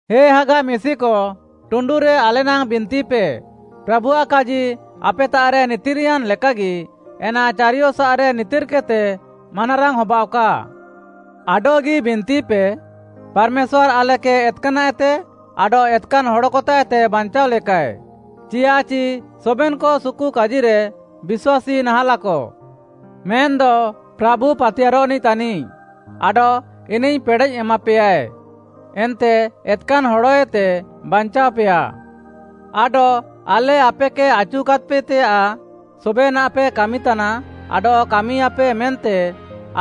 ହେ ହାଗା ମିଶିକ ଟୁଣ୍ଡୁରେ ଆଲେ ନାଙ୍ଗ୍‌ ବିନ୍ତିପେ, ପ୍ରାଭୁଆଃ କାଜି ଆପେତାଃରେ ନିତିର୍‍ୟାନ୍‌ ଲେକାଗି ଏନା ଚାରିୟସାଃରେ ନିତିର୍‌କେଦ୍‌ତେ ମାନାରାଙ୍ଗ୍‌ ହବାଅଃକା। ଆଡଃଗି ବିନ୍ତିପେ, ପାର୍‌ମେଶ୍ୱାର୍‌ ଆଲେକେ ଏତ୍‌କାନାଃଏତେ ଆଡଃ ଏତ୍‍କାନ୍‌ ହଡ଼କତାଃଏତେ ବାଞ୍ଚାଅଲେକାଏ, ଚିୟାଃଚି ସବେନ୍‌କ ସୁକୁକାଜିରେ ବିଶ୍ୱାସୀ ନାହାଁଲାକ। ମେନ୍‌ଦ ପ୍ରାଭୁ ପାତିୟାର୍‌ରଃନିଃ ତାନିଃ, ଆଡଃ ଇନିଃ ପେଡ଼େଃ ଏମାପେୟାଏ, ଏନ୍ତେ ଏତ୍‌କାନ୍‌ ହଡ଼ଏତେ ବାଞ୍ଚାଅପେୟା। ଆଡଃ ଆଲେ ଆପେକେ ଆଚୁକାଦ୍‌ପେତେୟାଃ ସବେନାଃପେ କାମିତାନା ଆଡଃ କାମିୟାପେ, ମେନ୍ତେ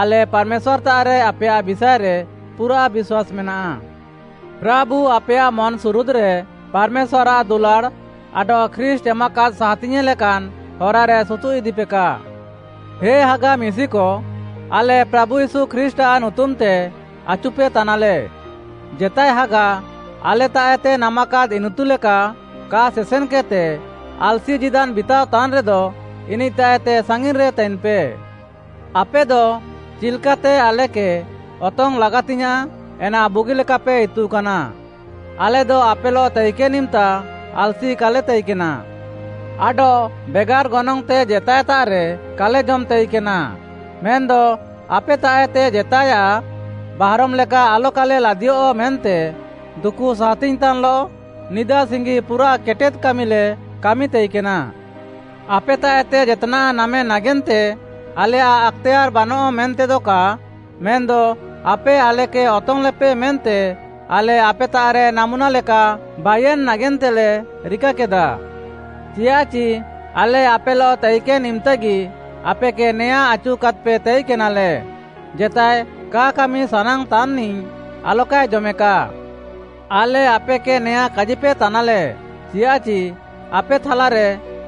ଆଲେ ପାର୍‌ମେଶ୍ୱାର୍‌ତାଃରେ ଆପେୟାଃ ବିଷାଏରେ ପୁରାଃ ବିଶ୍ୱାସ୍‌ ମେନାଃ। ପ୍ରାଭୁ ଆପେୟାଃ ମନ୍‍ସୁରୁଦ୍‌ରେ ପାର୍‌ମେଶ୍ୱାର୍‌ଆଃ ଦୁଲାଡ଼୍‌ ଆଡଃ ଖ୍ରୀଷ୍ଟ୍‌ ଏମାକାଦ୍‌ ସାହାତିଙ୍ଗ୍‌ୟେଁ ଲେକାନ୍‌ ହରାରେ ସୁତୁଃ ଇଦିପେକା। ହେ ହାଗା ମିଶିକ, ଆଲେ ପ୍ରାଭୁ ୟୀଶୁ ଖ୍ରୀଷ୍ଟ୍‌ଆଃ ନୁତୁମ୍‌ତେ ଆଚୁପେ ତାନାଲେ, ଜେତାଏ ହାଗା, ଆଲେତାଃଏତେ ନାମାକାଦ୍‌ ଇନିତୁଲେକା କା ସେସେନ୍‌କେଦ୍‌ତେ ଆଲ୍‌ସି ଜୀଦାନ୍‌ ବିତାଅତାନ୍‌ରେଦ, ଇନିଃତାଃଏତେ ସାଙ୍ଗିନ୍‌ରେ ତାଇନ୍‌ପେ। ଆପେଦ ଚିଲ୍‍କାତେ ଆଲେକେ ଅତଙ୍ଗ୍‌ ଲାଗାତିଙ୍ଗ୍‌ୟାଁଃ ଏନା ବୁଗିଲେକାପେ ଇତୁକାନା, ଆଲେଦ ଆପେଲଃ ତାଇକେନ୍‌ ଇମ୍‌ତା ଆଲ୍‌ସି କାଲେ ତାଇକେନା। ଆଡଃ ବେଗାର୍‌ ଗନଙ୍ଗ୍‌ତେ ଜେତାଏତାଃରେ କାଲେ ଜମ୍‍ ତାଇକେନା, ମେନ୍‌ଦ ଆପେତାଃଏତେ ଜେତାଏୟାଃ ବାହାରମ୍ ଲେକା ଆଲକାଲେ ଲାଦିୟଃ ମେନ୍ତେ ଦୁକୁ ସାହାତିଙ୍ଗ୍‌ତାନ୍‌ଲଃ ନିଦା ସିଙ୍ଗି ପୁରାଃ କେଟେଦ୍‌ କାମିଲେ କାମି ତାଇକେନା। ଆପେତାଃଏତେ ଜେତ୍‌ନାଃ ନାମେ ନାଗେନ୍ତେ ଆଲେୟାଃ ଆକ୍‌ତେୟାର୍‌ ବାନଃଆ ମେନ୍ତେଦ କା, ମେନ୍‌ଦ ଆପେ ଆଲେକେ ଅତଙ୍ଗ୍‌ଲେପେ ମେନ୍ତେ, ଆଲେ ଆପେତାଃରେ ନାମୁନା ଲେକା ବାଇୟେନ୍‌ ନାଗେନ୍ତେଲେ ରିକାକେଦା। ଚିୟାଃଚି ଆଲେ ଆପେଲଃ ତାଇକେନ୍‌ ଇମ୍‍ତାଗି ଆପେକେ ନେଆଁଁ ଆଚୁକାଦ୍‌ପେ ତାଇକେନାଲେ, ଜେତାଏ କା କାମି ସାନାଙ୍ଗ୍‌ତାନ୍‌ନିଃ ଆଲକାଏ ଜମେକା। ଆଲେ ଆପେକେ ନେଆଁଁ କାଜିପେତାନାଲେ, ଚିୟାଃଚି ଆପେ ଥାଲାରେ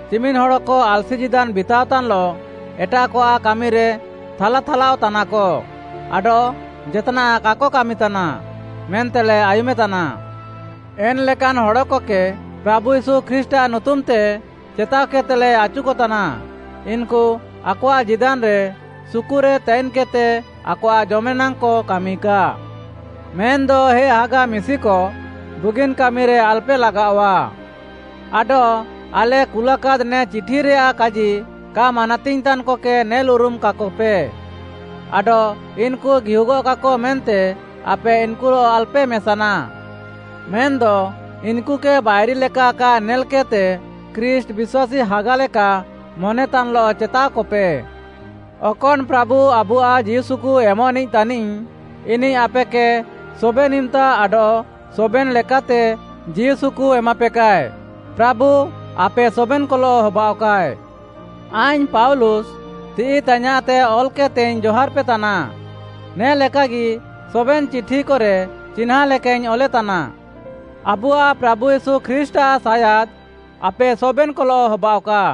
ଚିମିନ୍‌ ହଡ଼କ ଆଲ୍‌ସି ଜୀଦାନ୍‌ ବିତାଅତାନ୍‌ଲଃ ଏଟାଃକଆଃ କାମିରେ ଥାଲା ଥାଲାଅଃତାନାକ ଆଡଃ ଜେତ୍‌ନାଃ କାକ କାମିତାନା, ମେନ୍ତେଲେ ଆୟୁମେତାନା। ଏନ୍‌ ଲେକାନ୍‌ ହଡ଼କକେ ପ୍ରାଭୁ ୟୀଶୁ ଖ୍ରୀଷ୍ଟ୍‌ଆଃ ନୁତୁମ୍‌ତେ ଚେତାଅକେଦ୍‌ତେଲେ ଆଚୁକତାନା, ଇନ୍‌କୁ ଆକଆଃ ଜୀଦାନ୍‌ରେ ସୁକୁରେ ତାଇନ୍‌କେଦ୍‌ତେ ଆକଆଃ ଜମେନାଙ୍ଗ୍‌କ କାମିକା। ମେନ୍‌ଦ ହେ ହାଗା ମିଶିକ, ବୁଗିନ୍‌ କାମିରେ ଆଲ୍‌ପେ ଲାଗାଅଃଆ। ଆଡଃ ଆଲେ କୁଲାକାଦ୍‌ ନେ ଚିଠିରେୟାଃ କାଜି କା ମାନାତିଙ୍ଗ୍‌ତାନ୍‌କକେ ନେଲ୍‌ ଉରୁମାକାକପେ, ଆଡଃ ଇନ୍‌କୁ ଗିହୁଗଃକାକ ମେନ୍ତେ ଆପେ ଇନ୍‍କୁଲଃ ଆଲ୍‌ପେ ମେସାନା। ମେନ୍‌ଦ ଇନ୍‌କୁକେ ବାଇରି ଲେକା କା ନେଲ୍‌କେଦ୍‌ତେ ଖ୍ରୀଷ୍ଟ୍‌ ବିଶ୍ୱାସୀ ହାଗାଲେକା ମନେତାନ୍‌ଲଃ ଚେତାଅକପେ। ଅକନ୍‌ ପ୍ରାଭୁ ଆବୁଆଃ ଜୀଉସୁକୁ ଏମଃନିଃ ତାନିଃ, ଇନିଃ ଆପେକେ ସବେନ୍‌ ଇମ୍‌ତା ଆଡଃ ସବେନ୍‌ ଲେକାତେ ଜୀଉସୁକୁ ଏମାପେକାଏ। ପ୍ରାଭୁ ଆପେ ସବେନ୍‌କଲଃ ହବାଅଃକା। ଆଇଙ୍ଗ୍‌ ପାଉଲୁସ୍‌, ତିଃଇ ତାଇୟାଁଃତେ ଅଲ୍‍କେଦ୍‍ତେଇଙ୍ଗ୍‌ ଜହାର୍‍ପେତାନା, ନେ ଲେକାଗି ସବେନ୍‌ ଚିଠିକରେ ଚିହ୍ନାଁ ଲେକାଇଙ୍ଗ୍‌ ଅଲେତାନା। ଆବୁଆଃ ପ୍ରାଭୁ ୟୀଶୁ ଖ୍ରୀଷ୍ଟ୍‌ଆଃ ସାୟାଦ୍‌ ଆପେ ସବେନ୍‍କଲଃ ହବାଅଃକା।